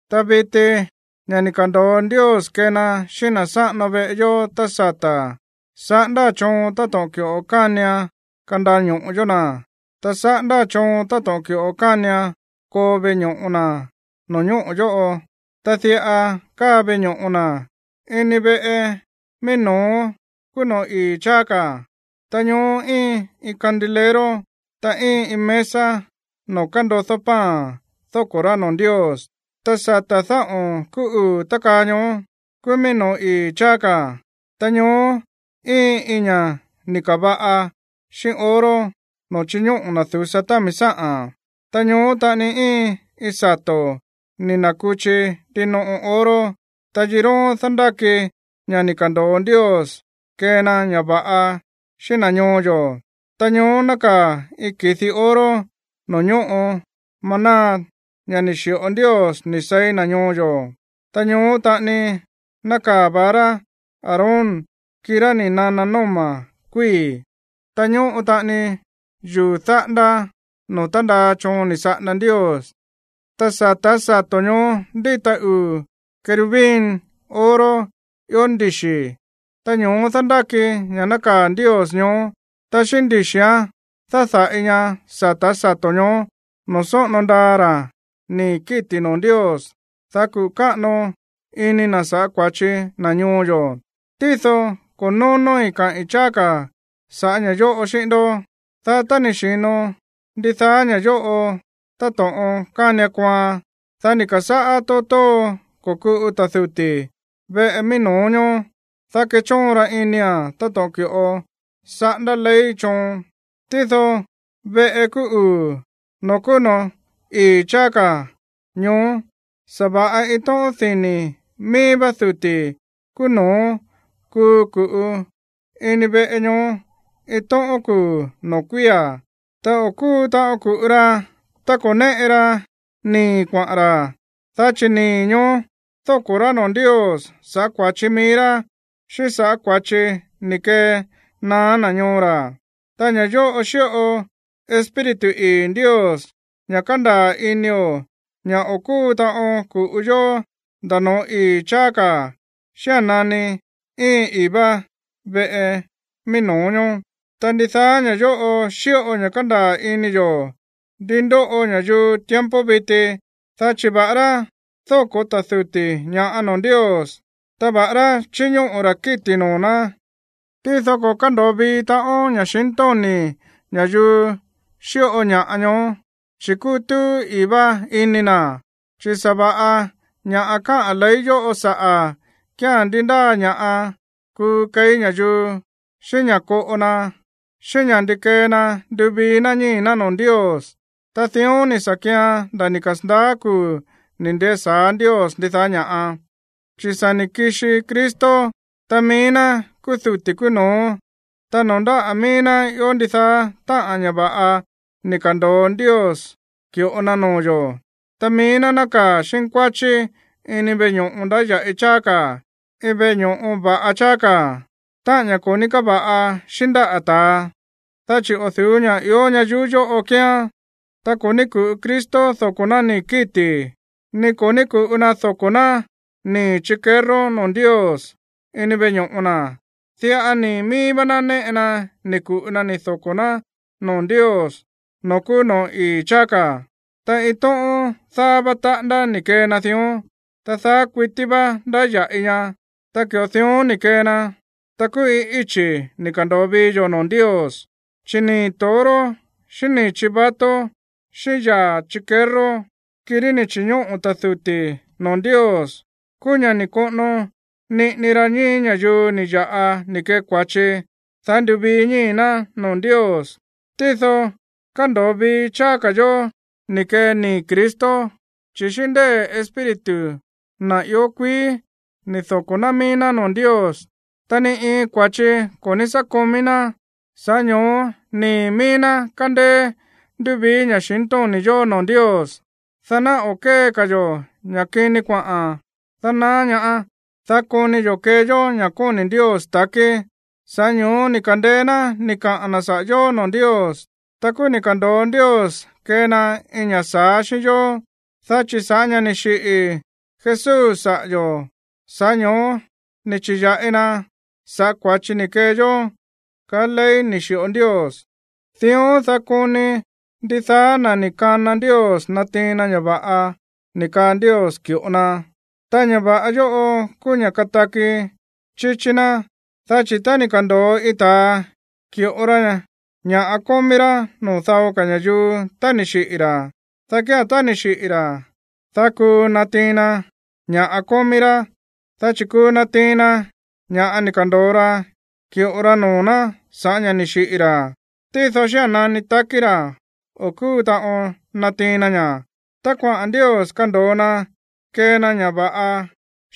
Ta viti, ña̱ ni̱ ka̱ndo̱o Ndios kee na xíꞌín na̱ sáꞌano veꞌe yó tá sata̱ saꞌándáa̱n choon táto̱ꞌon ki̱ꞌo kánian kandaño̱ꞌo yó na̱, ta saꞌándáa̱n choon táto̱ꞌon ki̱ꞌo kánian koo veꞌe ño̱ꞌo na̱ no̱ñóꞌo̱ yóꞌo. Ta diꞌa káa veꞌe ño̱ꞌo na̱: ini veꞌe mií no̱ó kúú noo̱ ii̱ cháá, ta ñoó íin iin candilero, ta íin iin mesa noo̱ kándodó pan dóko̱ rá noo̱ Ndios. Ta sata̱ dáꞌo̱n kúú uu̱ tákaa ñoó kúú míí noo̱ ii̱ cháá ka̱. Ta ñoó íin iin ña̱ꞌa ni̱ ka̱va̱ꞌa xíꞌín oro noo̱ chíñóꞌo̱ na̱ du̱sa támi sáꞌa̱n, ta ñoó taꞌani íin iin sato̱ ni̱ na̱kuchi ndinoꞌo oro, ta yiróón dándáki ña̱ ni̱ ka̱ndo̱o Ndios kee na ña̱ va̱ꞌa xíꞌín na̱ ñoo yo̱. Ta ñoó nákaa̱ iin ki̱di oro noo̱ ñóꞌo maná, ña̱ ni̱ xi̱ꞌo Ndios ni̱ seí na̱ ñoo yo̱, ta ñoó taꞌani nákaa̱ vara Aarón, kirá ni̱ nana nóma̱ kuíi̱, ta ñóꞌo taꞌani yuu̱ dáꞌándá noo̱ tándaa choon ni̱ saꞌanda Ndios. Ta sa̱tá sato̱ ñoó ndíta uu̱ querubín oro ió ndixi̱, ta ño̱ó dándáki ña̱ nákaa̱ Ndios ñoó, ta xíꞌín ndixi̱án dáda̱ꞌi ña sa̱tá sato̱ ñoó, noo̱ sóꞌono ndaa ra̱ nii̱ kíti̱ noo̱ Ndios, dá kuꞌu̱ káꞌano ini na̱ sa̱ꞌá kua̱chi na̱ ñoo yo̱. Tído ko̱ nónóí kaꞌi̱n cháá ka̱ sa̱ꞌá ña̱ yóꞌo xíꞌín ndó. Dá tá ni̱ xi̱no ndidaá ña̱ yóꞌo táto̱ꞌon kánian kooan, dá ni̱ ka̱sáꞌá tóo tóo ko̱kuꞌu ta̱ duti̱ veꞌe mií no̱ó ñoó, dá kechóon ra inia̱n táto̱ꞌon ki̱ꞌo saꞌándá ley choon. Tído veꞌe kúú uu̱, noo̱ kúú noo̱ ii̱ cháá ka̱ ñoó, sa̱va̱ꞌa iin tóꞌón dini̱ míí vá ta̱ duti̱ kúú no̱ó kuu ku̱ꞌu ini veꞌe ñoó iin tóꞌón kuu̱ noo̱ kuía̱. Ta o̱ kúu taꞌon ku̱ꞌu ra tá ko̱ néꞌe ra nii̱ kuaꞌa̱n ra̱, dá chi̱ nii̱ ñoó dóko̱ rá noo̱ Ndios sa̱ꞌá kua̱chi mií rá xíꞌín sa̱ꞌá kua̱chi ni̱ kenaá na̱ ñoo ra̱. Ta ña̱ yóꞌo xíꞌo Espíritu ii̱ Ndios ña̱ kándaa̱ inio̱ ña̱ o̱ kúu taꞌon ku̱ꞌu yó nda̱ no̱ó ii̱ cháá ka̱ xía̱n nani íin ii̱ vá veꞌe mií no̱ó ñoó. Ta ndidaá ña̱ yóꞌo xíꞌo ña̱ kándaa̱ ini yo̱ ndi ndóꞌo ña̱yuu tiempo viti, dá chi̱ va̱ꞌará dóko̱ ta̱ duti̱ ña̱ꞌa noo̱ Ndios, ta va̱ꞌará chíñóꞌo̱ ra̱ kíti̱ noo̱ ná, tído ko̱ kándo̱o vii taꞌon ña̱xintóni̱ ña̱yuu xíꞌo ña̱ꞌa ñoó, chi̱ kútúú ii̱ vá ini na̱. Dá chi̱ sa̱va̱ꞌa ña̱ꞌa káꞌa̱n ley yóꞌo saꞌa̱ kía̱n ndi ndáa ña̱ꞌa kuu keí ña̱yuu, xíꞌín ña̱ koꞌo na, xíꞌín saꞌa̱ ndi kee na nduvii ná ñíi̱ ná noo̱ Ndios, ta dión ni̱ sa̱ kian nda̱ ni̱ kasa̱ndaá kuu̱ ni̱ ndesa̱á Ndios ndidaá ña̱ꞌa. Chi̱ sa̱ ni̱ kixi Cristo, ta mií ná kúú duti̱ kúú no̱ó, ta noo̱ ndáꞌa̱ míí ná ió ndidaá táꞌa̱n ña̱ va̱ꞌa ni̱ ka̱ndo̱o Ndios ki̱ꞌo na noo̱ yo̱. Ta mií ná nákaa̱ xínkuáchí ini veꞌe ño̱ꞌo ndáya̱ꞌi cháá ka̱, iin veꞌe ño̱ꞌo va̱ꞌa cháá ka̱, táꞌa̱n ña̱ ko̱ ní káva̱ꞌa xíꞌín ndáꞌa̱ ta̱a, dá chi̱ o̱ du̱ú ña̱ꞌa ió ñayuú yóꞌo kíán. Ta ko̱ ní ku̱ꞌu Cristo doko̱ ná nii̱ kíti̱, ni ko̱ ní ku̱ꞌu na doko̱ ná nii̱ chikerró noo̱ Ndios ini veꞌe ño̱ꞌo na̱. Diꞌa nii̱ míí vá ná néꞌe na ni̱ ku̱ꞌu na ni̱ doko̱ ná noo̱ Ndios noo̱ kúú noo̱ ii̱ cháá ka̱, ta iin tóꞌón dáá vá taꞌándá ni̱ kee na dión, ta daá kuití vá ndáya̱ꞌi ña. Ta ki̱ꞌo dión ni̱ kee na, ta kúú iin íchi̱ ni̱ ka̱ndo̱o vii yo̱ noo̱ Ndios. Chi̱ nii̱ toro, xíꞌín nii̱ chivato, xíꞌín yaa̱ chikerró, kirí ni̱ chi̱ñóꞌo̱ ta̱ duti̱ noo̱ Ndios, kúú ña̱ ni̱ soꞌono niꞌini ra ñíi̱ ña̱yuu ni̱ ya̱ꞌa ni̱ kee kua̱chi, dá nduvii ñíi̱ ná noo̱ Ndios. Tído kándo̱o vii cháá ka̱ yo̱ ni̱ kee nii̱ Cristo, chi̱ xíꞌín ndée̱ Espíritu, na̱ ió kuií, ni̱ doko̱ ná mií ná noo̱ Ndios, ta ni iin kua̱chi ko̱ ní sá komí ná. Sa̱ꞌá ño̱ó nii̱ míí ná kándéé nduvii ña̱xintóni̱ yo̱ noo̱ Ndios, dá ná o̱ kée ka̱ yo̱ ña̱ kini kuaꞌa̱n dánaá ñaá, dá koni yo̱ kee yó ña̱ kóni̱ Ndios ta̱kí. Sa̱ꞌá ño̱ó ni̱ ka̱ndeé ná ni̱ kaꞌa̱n na̱ saꞌa̱ yo̱ noo̱ Ndios, ta kúú ni̱ ka̱ndo̱o Ndios kee na iin ña̱ sa̱á xíꞌín yó. Dá chi̱ sa̱ꞌá ña̱ ni̱ xiꞌi̱ Jesús saꞌa̱ yo̱, sa̱ꞌá ño̱ó ni̱ chi̱ya̱ꞌi na sa̱ꞌá kua̱chi ni̱ kee yó kaá ley ni̱ xi̱ꞌo Ndios. Dión, dá koni ndidaá na̱ ni̱ kana Ndios natiin na ña̱ va̱ꞌa ni̱ kaa Ndios ki̱ꞌo na, ta ña̱ va̱ꞌa yóꞌo kúú ña̱ kataki chíchí ná. Dá chi̱ tá ni̱ ka̱ndo̱o iin ta̱a ki̱ꞌo ra ña̱ꞌa kómí rá noo̱ dao ka̱ ña̱yuu tá ni̱ xiꞌi̱ ra̱, dá kía̱n tá ni̱ xiꞌi̱ ra̱, dá kuu natiin na ña̱ꞌa kómí rá. Dá chi̱ kuu natiin na ña̱ ni̱ ka̱ndo̱o ra ki̱ꞌo ra noo̱ ná sa̱ꞌá ña̱ ni̱ xiꞌi̱ ra̱. Tído xía̱n nani takí ra̱, o̱ kúu taꞌon natiin na ña̱. Tá kuaꞌa̱n Ndios kando̱o na kee na ña̱ va̱ꞌa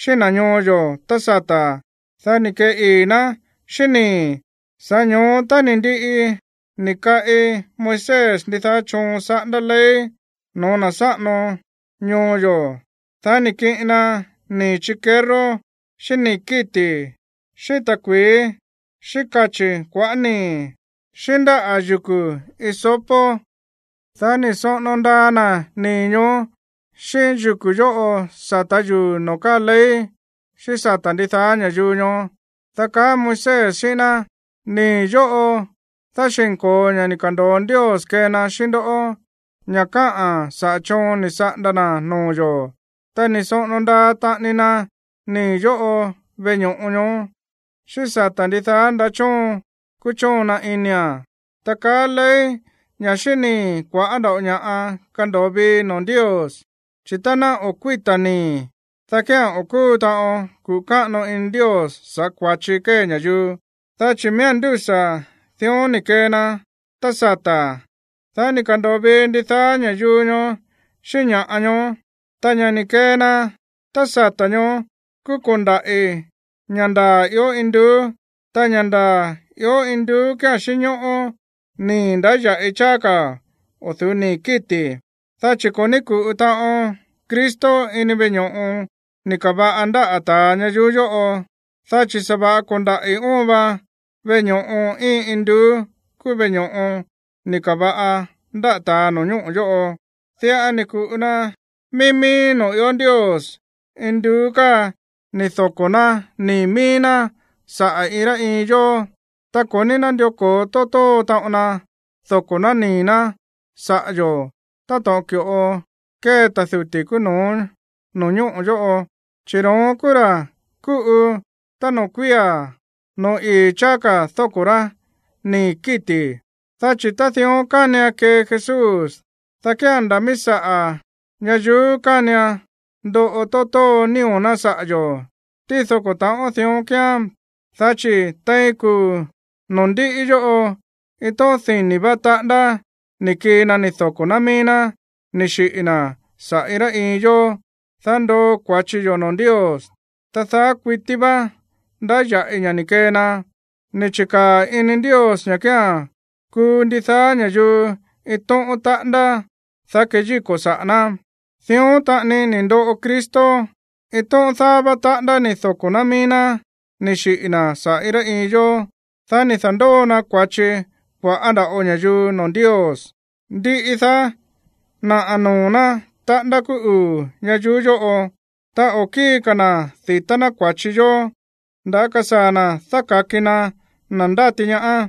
xíꞌín na̱ ñoo yo̱ tá sata̱, dá ni̱ kee ii̱ náa̱n xíꞌín nii̱. Sa̱ꞌá ño̱ó tá ni̱ ndiꞌi ni̱ kaꞌi Moisés ndidaá choon saꞌándá ley no̱ó na̱ sáꞌano ñoo yo̱, dá ni̱ kiꞌin na nii̱ chikerró, xíꞌín nii̱ kíti̱, xíꞌín ta̱kui̱í, xíꞌín kachi̱ kuaꞌá nii̱, xíꞌín ndáꞌa̱ yuku̱ hisopo, dá ni̱ soꞌono ndaa na̱ nii̱ ñoó xíꞌín yuku̱ yóꞌo sa̱tá yuu̱ noo̱ káa ley, xíꞌín sata̱ ndidaá ña̱yuu ñoó. Dá kaá Moisés xíꞌín ná: “Nii̱ yóꞌo dáxi̱nko̱o ña̱ ni̱ ka̱ndo̱o Ndios kee na xíꞌín ndoꞌó, ña̱ káꞌa̱n saꞌa̱ choon ni̱ saꞌanda na̱ noo̱ yo̱.” Ta ni̱ soꞌono ndaa taꞌani na nii̱ yóꞌo veꞌe ño̱ꞌo ñoó, xíꞌín sata̱ ndidaá ndaꞌá choon kúchóon na inia̱n. Ta kaá ley ña̱ xíꞌín nii̱ kua̱ꞌá nda̱ꞌo ña̱ꞌa kando̱o vii noo̱ Ndios. Chi̱ tá ná o̱ kuíta̱ nii̱, dá kía̱n o̱ kúu taꞌon kuꞌu̱ káꞌano ini Ndios sa̱ꞌá kua̱chi kée ña̱yuu. Dá chi̱ miía̱n ndúsa̱ dión ni̱ kee na tá sata̱, dá ni̱ ka̱ndo̱o vii ndidaá ña̱ꞌa ñoó. Ta ña̱ ni̱ kee na tá sata̱ ñoó kúú ko̱ndaꞌi̱ ña̱ ndaa̱ ió induú. Ta ña̱ ndaa̱ ió induú kía̱n xínñóꞌó nii̱ ndáya̱ꞌi cháá ka̱ o̱ du̱ú nii̱ kíti̱. Dá chi̱ ko̱ ní ku̱ꞌu taꞌon Cristo ini veꞌe ño̱ꞌo ni̱ ka̱va̱ꞌa ndáꞌa̱ ta̱a ñayuú yóꞌo, dá chi̱ sa̱va̱ꞌa ko̱ndaꞌi̱ óon va veꞌe ño̱ꞌo íin induú kúú veꞌe ño̱ꞌo ni̱ ka̱va̱ꞌa ndáꞌa̱ ta̱a no̱ñóꞌo̱ yóꞌo. Diꞌa ni̱ ku̱ꞌu na mií mií noo̱ ió Ndios induú ni̱ doko̱ ná nii̱ míí ná saꞌa̱ iin rá iin yó. Ta ko̱ ní nándió ko̱o tóo tóo taꞌon na doko̱ ná nii̱ ná saꞌa̱ yo̱ táto̱ꞌon ki̱ꞌo kée ta̱ duti̱ kúú no̱ó no̱ñóꞌo̱ yóꞌo, chi̱ ro̱ón kúú ra̱ kúꞌu tá noo̱ kuía̱ no̱ó ii̱ cháá ka̱ dóko̱ rá nii̱ kíti̱. Dá chi̱ tá dión kánian kee Jesús, dá kía̱n nda̱ míí saꞌa̱ ñayuú kánian ndoꞌo tóo tóo nío̱ ná saꞌa̱ yo̱. Tído ko̱ ta̱ꞌón dión kíán, dá chi̱ tein kuu̱ noo̱ ndiꞌi yóꞌo iin tóꞌón dini̱ vá taꞌándá ni̱ kii na ni̱ doko̱ ná mií ná ni̱ xiꞌi̱ na̱ saꞌa̱ iin rá iin yó, dá ndoo kua̱chi yó noo̱ Ndios, ta daá kuití vá ndáya̱ꞌi ña̱ ni̱ kee na. Ni̱ chi̱kaa̱ ini Ndios ña̱ kía̱n kuu ndidaá ña̱yuu iin tóꞌón taꞌándá, dá keyíko̱ saꞌa̱ ná. Dión taꞌani ni̱ ndoꞌo Cristo. Iin tóꞌón dáá vá taꞌándá ni̱ doko̱ ná mií ná ni̱ xiꞌi̱ na̱ saꞌa̱ iin rá iin yó, dá ni̱ da̱ndóo na kua̱chi kua̱ꞌá nda̱ꞌo ña̱yuu noo̱ Ndios. Ndiꞌi daá, naꞌa̱ noo̱ ná taꞌándá kúú uu̱ ñayuú yóꞌo. Ta o̱ kíi ka̱ na̱ di̱tá ná kua̱chi yó, nda̱á kasaa̱ na̱ dáka̱ki na na̱ ndáti ñaá.